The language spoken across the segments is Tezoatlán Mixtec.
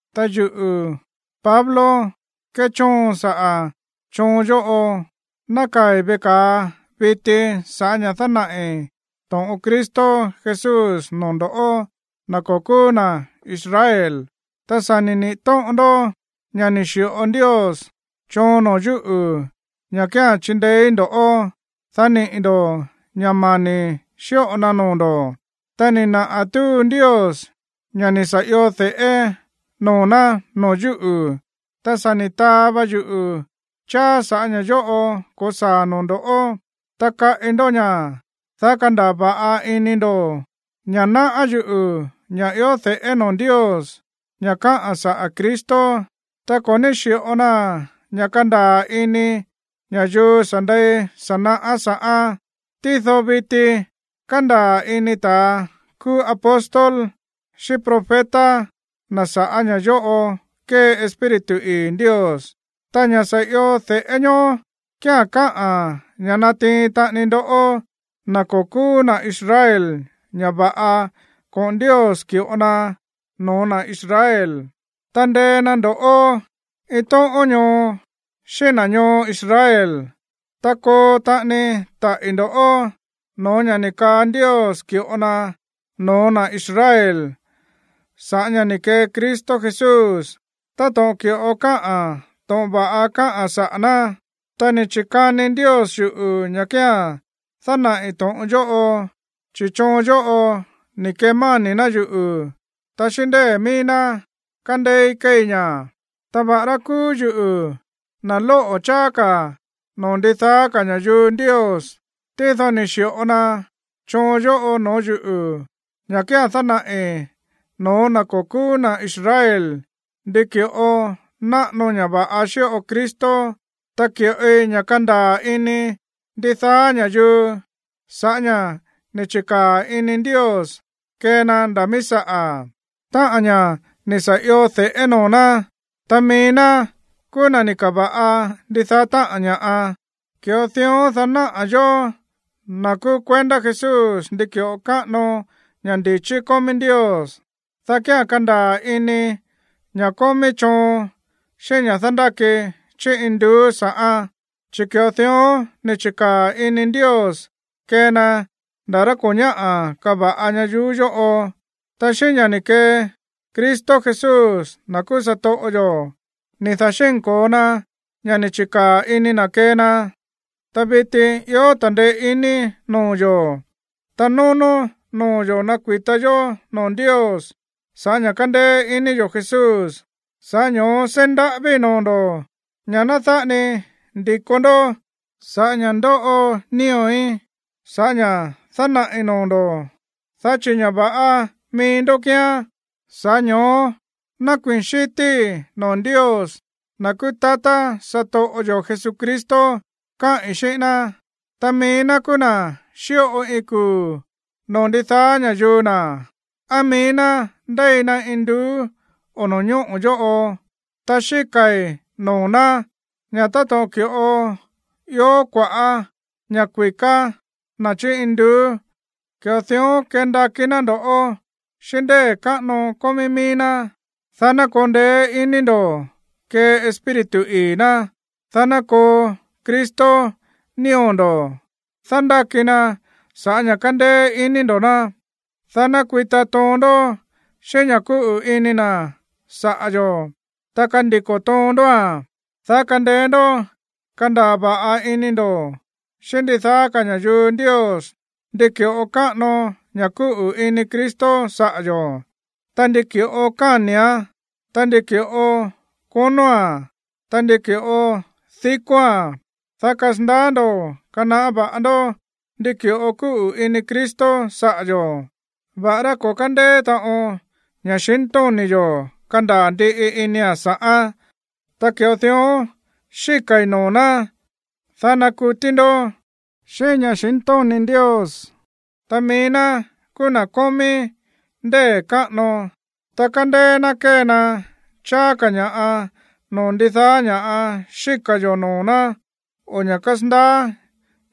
Ta yuꞌu̱, Pablo, kéchóon saꞌa̱ choon yóꞌo. Nákaa̱i̱ veꞌe ka̱a viti sa̱ꞌá ña̱ dánaꞌi̱ to̱ꞌon Cristo Jesús noo̱ ndo̱ꞌó, na̱ ko̱ kúú na̱ Israel. Ta sa̱ ni̱ niꞌi̱ tóꞌon ndó ña̱ ni̱ xi̱ꞌo Ndios choon noo̱ yúꞌu̱ ña̱ kía̱n chindeéí ndo̱ꞌó, dá niꞌi̱ ndo̱ ña̱ mani̱ xíꞌo na noo̱ ndo̱. Ta ni̱ naꞌa̱ túu Ndios ña̱ ni̱ sa̱ io de̱ꞌé noo̱ ná noo̱ yúꞌu̱. Ta sa̱ ni̱ taa va yuꞌu̱ cháá sa̱ꞌá ña̱ yóꞌo ko̱saa̱a̱n noo̱ ndo̱. Tá kaꞌi ndó ña̱, dá kandaa̱ va̱ꞌa ini ndo̱ ña̱ náꞌá yuꞌu̱ ña̱ ió de̱ꞌé noo̱ Ndios, ña̱ káꞌa̱n saꞌa̱ Cristo. Ta ko̱ ní xi̱ꞌo na ña̱ kandaa̱ ini ña̱yuu sa̱ ndei sa̱ naꞌá sa̱ꞌán. Tído viti kándaa̱ ini na̱ kúú apóstol xíꞌín profeta na̱ sa̱ꞌá ña̱ yóꞌo kée Espíritu ii̱ Ndios. Táꞌa̱n ña̱ sa̱ io de̱ꞌé ñoó kía̱n kaá ña̱ natiin taꞌani ndoꞌó, na̱ ko̱ kúú na̱ Israel, ña̱ va̱ꞌa koꞌo̱n Ndios ki̱ꞌo na no̱ó na̱ Israel, ta ndee na ndo̱ꞌó iin tóꞌón ñoo xíꞌín na̱ ñoo Israel, ta koo taꞌani taꞌi̱ ndo̱ no̱ó ña̱ ni̱ kaa Ndios ki̱ꞌo na no̱ó na̱ Israel sa̱ꞌá ña̱ ni̱ kee Cristo Jesús, táto̱ꞌon ki̱ꞌo káꞌa̱n to̱ꞌon va̱ꞌa káꞌa̱n saꞌa̱ ná. Ta ni̱ chi̱kani Ndios yuꞌu̱ ña̱ kía̱n dánaꞌi̱ to̱ꞌon yóꞌo, chi̱ choon yóꞌo ni̱ kemáni̱ ná yuꞌu̱, ta xíꞌín ndée̱ mií ná kándééí kéei ña̱. Ta va̱ꞌará kúú yuꞌu̱ na̱ lóꞌo̱ cháá ka̱ noo̱ ndidaá ka̱ ña̱yuu Ndios, tído ni̱ xi̱ꞌo na choon yóꞌo no̱ó yuꞌu̱, ña̱ kía̱n dánaꞌi̱ no̱ó na̱ ko̱ kúú na̱ Israel ndi ki̱ꞌo náꞌano ña̱ va̱ꞌa xíꞌo Cristo, ta ki̱ꞌoi ña̱ kandaa̱ ini ndidaá ña̱yuu sa̱ꞌá ña̱ ni̱ chi̱kaa̱ ini Ndios kee na nda̱ míí saꞌa̱, táꞌa̱n ña̱ ni̱ sa̱ io de̱ꞌé noo̱ ná, ta mií ná kúú na̱ ni̱ ka̱va̱ꞌa ndidaá táꞌa̱n ña̱ꞌa. Ki̱ꞌo dión, dá naꞌa̱ yóó, na̱ kúú kuendá Jesús, ndi ki̱ꞌo káꞌano ña̱ ndi̱chí kómí Ndios, dá kía̱n kandaa̱ ini ña̱ kómí choon xíꞌín ña̱ dándáki chí induú sa̱ꞌán. Chi̱ ki̱ꞌo dión ni̱ chi̱kaa̱ ini Ndios kee na nda̱ rá ko̱ ñáꞌa̱ kava̱ꞌa ñayuú yóꞌo. Ta xíꞌín ña̱ ni̱ kee Cristo Jesús, na̱ kúú satoꞌo yo̱, ni̱ da̱xínko̱o na ña̱ ni̱ chi̱kaa̱ ini na̱ kee na. Ta viti ió ta̱ndeé iní noo̱ yo̱, ta nónó noo̱ yo̱ nakui̱ta yó noo̱ Ndios sa̱ꞌá ña̱ kándéé iní yo̱ Jesús. Sa̱ꞌá ño̱ó seí ndaꞌávíi̱ noo̱ ndo̱ ña̱ ná dáꞌa ni ndi̱ko ndó sa̱ꞌá ña̱ ndóꞌo nío̱í sa̱ꞌá ña̱ dánaꞌi̱ noo̱ ndo̱ꞌó, dá chi̱ ña̱ va̱ꞌa mií ndó kíán. Sa̱ꞌá ño̱ó nákuii̱n xi̱tíí noo̱ Ndios, na̱ kuu tatá satoꞌo yo̱ Jesucristo, káꞌi̱n xíꞌín ná. Ta mií ná kúú na̱ xíꞌo iin kuu̱ noo̱ ndidaá ña̱yuu na̱, á mií ná ndéi na induú o no̱ñóꞌo̱ yóꞌo. Ta xíka̱i̱ noo̱ ná ña̱ táto̱ꞌon ki̱ꞌo ió kua̱ꞌá ña̱ kui̱ká na̱ chí induú, ki̱ꞌo dión kendakí ná ndo̱ꞌó xíꞌín ndée̱ káꞌano kómí míí ná, dá ná koo ndeé iní ndo̱ kee Espíritu ii̱ ná, dá ná koo Cristo nío̱ ndo̱ dándáki na sa̱ꞌá ña̱ kándéé iní ndo̱ ná, dá ná kui̱ta toon ndó xíꞌín ña̱ kúꞌu̱ ini na̱ saꞌa̱ yo̱, ta kandiko̱ toon ndóa̱n, dá kandeé ndó kandaa̱ va̱ꞌa ini ndo̱ xíꞌín ndidaá ka̱ ña̱yuu Ndios ndi ki̱ꞌo káꞌano ña̱ kúꞌu̱ ini Cristo saꞌa̱ yo̱, ta ndi ki̱ꞌo káni̱án, ta ndi ki̱ꞌo konóa̱n, ta ndi ki̱ꞌo dikóa̱n, dá kasandaá ndo̱ kanaꞌá va̱ꞌa ndó ndi ki̱ꞌo kúꞌu̱ ini Cristo saꞌa̱ yo̱, va̱ꞌará ko̱ kándeé taꞌon ña̱xintóni̱ yo̱ kandaa̱ ndiꞌi inia̱n sa̱ꞌán. Ta ki̱ꞌo dión xíka̱i̱ noo̱ ná, dá nakutí ndó xíꞌín ña̱xintóni̱ Ndios. Ta mií ná kúú na̱ kómí ndée̱ káꞌano, ta kándéé ná kée na cháá ka̱ ña̱ꞌa noo̱ ndidaá ña̱ xíka̱ yo̱ noo̱ ná o ña̱ kasandaá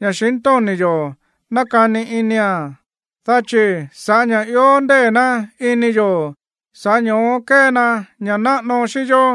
ña̱xintóni̱ yo̱ nakani inia̱n, dá chi̱ sa̱ꞌá ña̱ ió ndée̱ ná ini yo̱, sa̱ꞌá ño̱ó kée na ña̱ꞌa náꞌano xíꞌín yó.